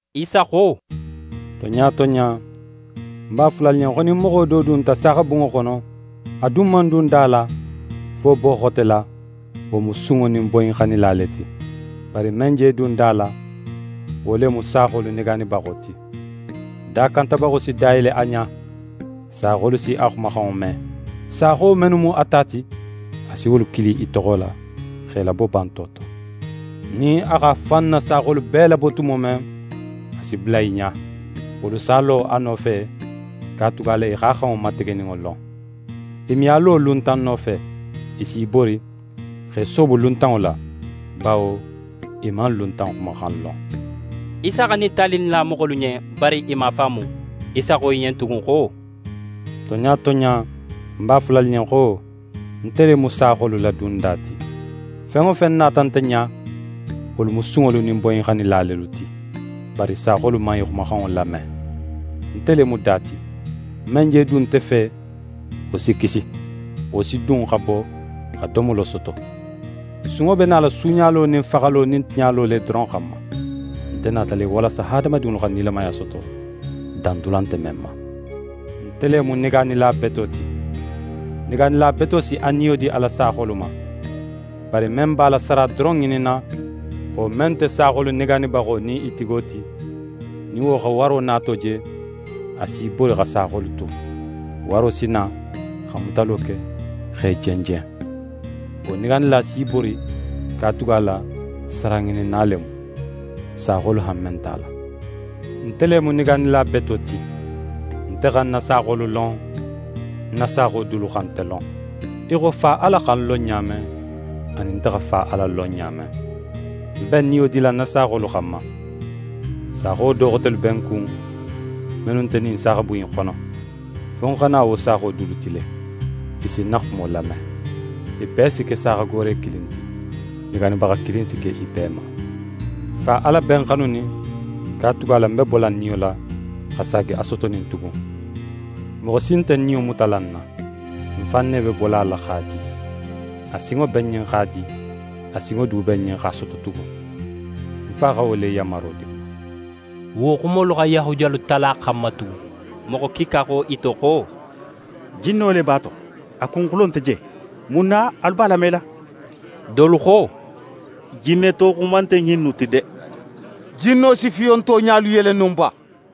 Isa xo: «Tonɲa tonɲa, ń b'a fola alu ɲen xo, nin moxo do dunta saaxabunŋo xono, a dun man dun da la, fo boxo xote la, wo mu sunŋo nin boyinxannila le ti. Bari men je dun da la, wo le mu saaxolu negaanibaxo ti. Dakantabaxo si da yele a ɲa, saaxolu si a xumaxanŋo me. Saaxo mennu mu a ta ti, a si wolu kili i toxo la, x'e labo banto to. Nin a x'a fan na saaxolu bee labo tumo men, a si bula i ɲa. Wolu s'a lo a nofe, katugala i x'a xanŋo mategeninŋo lon. I me a lo luntan nofe. I s'i bori, x'e soobo luntanŋo la, bawo i man luntan xumaxan lon.» Isa xa ɲin tali in la moxolu ɲen, bari i man a faamu. Isa xo i ɲen tugun xo: «Tonɲa tonɲa, ń b'a fola alu ɲen xo: Nte le mu saaxolu la dunda ti. Fen wo fen nata nte ɲa, wolu mu sunŋolu nin boyinxannila lelu ti. Bari saaxolu man i xumaxanŋo lame. Nte le mu da ti. Men je dun nte fe, wo si kisi. Wo si dun, xa bo, xa domolo soto. Sunŋo be nala suuɲalo nin faxalo nin tiɲalo le doron xanma. Nte nata le walasa hadamadinŋolu xa nilamaya soto, dandula nte men ma. Nte le mu negaanila beto ti. Negaanila beto si a niyo di a la saaxolu xanma. Bari men b'a la sara doron ŋininna, wo men nte saaxolu negaanibaxo nin i tigo ti, nin wo xa waro nato je, a s'í bori xa saaxolu tu. Waro si na, xa mutalo ke, x'e jenjen. Wo negaanila s'í bori, katugala saraŋininna le mu. Saaxolu hanme nt'a la. Nte le mu negaanila beto ti. Nte xa ń na saaxolu lon, ń na saaxo dulu xa nte lon, í xo Fa Ala xa ń lon ɲa men, anin nte xa Fa Ala lon ɲa men. Ń be ń niyo dila ń na saaxolu xanma. Saaxo do xotelu be ń kun, mennu nte ɲin saaxabun in xono. Fo ń xa na wo saaxo dulu ti le. I si ń na xumo lame. I bee si ke saaxagoore kilin ti. Negaanibaxa kilin si ke i bee ma. Fa Ala be ń xanunin, katugala ń be bola ń niyo la, xa saagi a sotonin tugun. Moxo si nte ń niyo mutala ń na. Ń fan ne be bola a la x'a di. A sinŋo be ń ɲen x'a di, a sinŋo du be ń ɲen, x'a soto tugun. Ń Fa xa wo le yanmaro di ń ma.» Wo xumolu xa Yahudiyalu tala xan ma tugun. Moxo kiika xo i to xo: «Jinno le b'a to. A kunxulo nte je. Mun na alu b'a lamela?» Dolu xo: «Jinneto xuma nte ɲinnu ti de! Jinno si fiyonto ɲalu yele no ba?»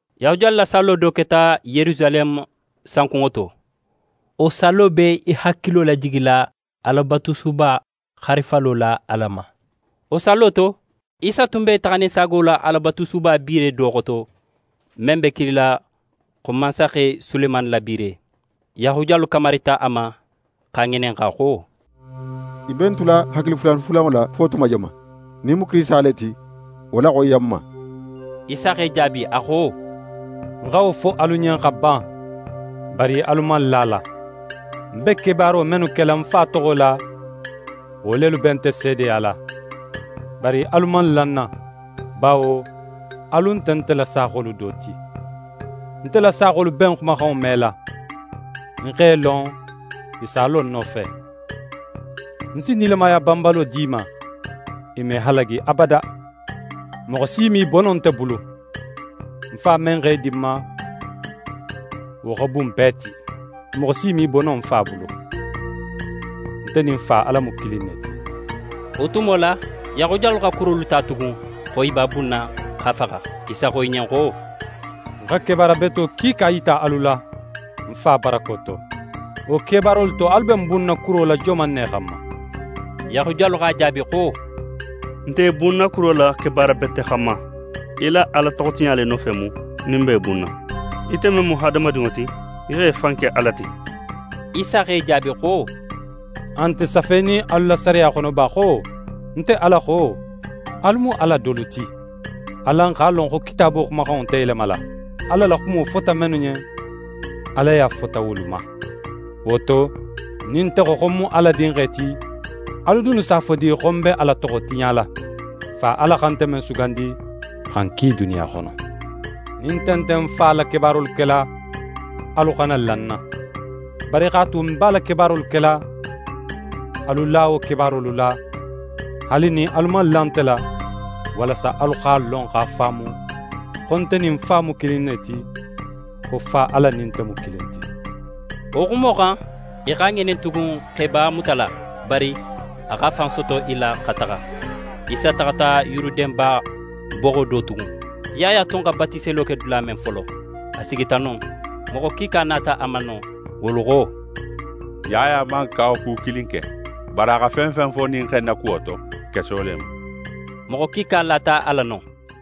Yahudiyalu la sallo do keta Yerusaleme sankunŋo to. Wo sallo be i hakilo lajigila Alabatusuba xarifalo la Ala ma. Wo sallo to, Isa tun be taxaninsaago la Alabatusuba biire do xoto, men be kilila xo mansaxe Sulemani la biire. Yahudiyalu kamarita a ma, x'a ŋininxa xo: «Í be n tula hakili fulanfulanŋo la fo tuma joman? Nin í mu Kirisita le ti, wo laxoyiya n ma.» Isa x'e jaabi, a xo: «Ń xa wo fo alu ɲen xa ban, bari alu man la a la. Ń be kebaaro mennu kela ń Fa toxo la, wo lelu be nte seedeyala. Bari alu man la ń na, bawo alu nte nte la saaxolu do ti. Nte la saaxolu be ń xumaxanŋo mela. Ń x'e lon, i s'a lo ń nofe. Ń si nilamaya banbalo di i ma, i me halagi abada. Moxo si me i bo no nte bulu. Ń Fa men x'e di ń ma, wo xa bun bee ti. Moxo si me i bo no ń Fa bulu. Nte nin Fa Ala mu kilin ne ti.» Wo tumo la, Yahudiyalu xa kurolu ta tugun, xo i b'a bunna x'a faxa. Isa xo i ɲen xo: «Ń xa kebaara beto kiika yita alu la, ń Fa barako to. Wo kebaarolu to, alu be ń bunna kuro la joman ne xanma?» Yahudiyalu x'a jaabi xo: «N nte í bunna kuro la kebaara bete xanma. Í la Ala toxotiɲa le nofe mu, nin n b'é bunna. Ite men mu hadamadinŋo ti, í x'é fan ke Ala ti.» Isa x'e jaabi xo: «A nte safenin alu la sariya xono ba xo: “Nte Ala xo: Alu mu ala dolu ti”? Alan x'a lon xo Kitaabo xumaxanŋo nte yelemala. Ala la xumo fota mennu ɲen, alaya fota wolu ma. Wo to, nin nte xo, xo ń mu Ala Dinxe ti, alu dunnu s'a fo di, xo ń be Ala toxo tiɲala? Fa Ala xa nte men sugandi, xa ń ki duniya xono. Nin nte nte ń Fa la kebaarolu kela, alu xana la ń na. Bari x'a tu, ń be a la kebaarolu kela, alu la wo kebaarolu la, haali nin alu man la nte la, walasa alu x'a lon, x'a faamu, xo nte nin ń Fa mu kilin ne ti, xo Fa Ala nin nte mu kilin ti.» Wo xumo xan, i x'a ŋinin tugun, x'e b'a mutala. Bari a x'a fan soto i la xa taxa. Isa taxata Yuruden ba boxo do tugun. Yaya tun xa batiselo ke dula men folo, a sigita non. Moxo kiika nata a ma non. Wolu xo: «Yaya man kawaku kilin ke. Bari a xa fen fen fo ɲin xe in na kuwo to, keso le mu.» Moxo kiika lata a la non.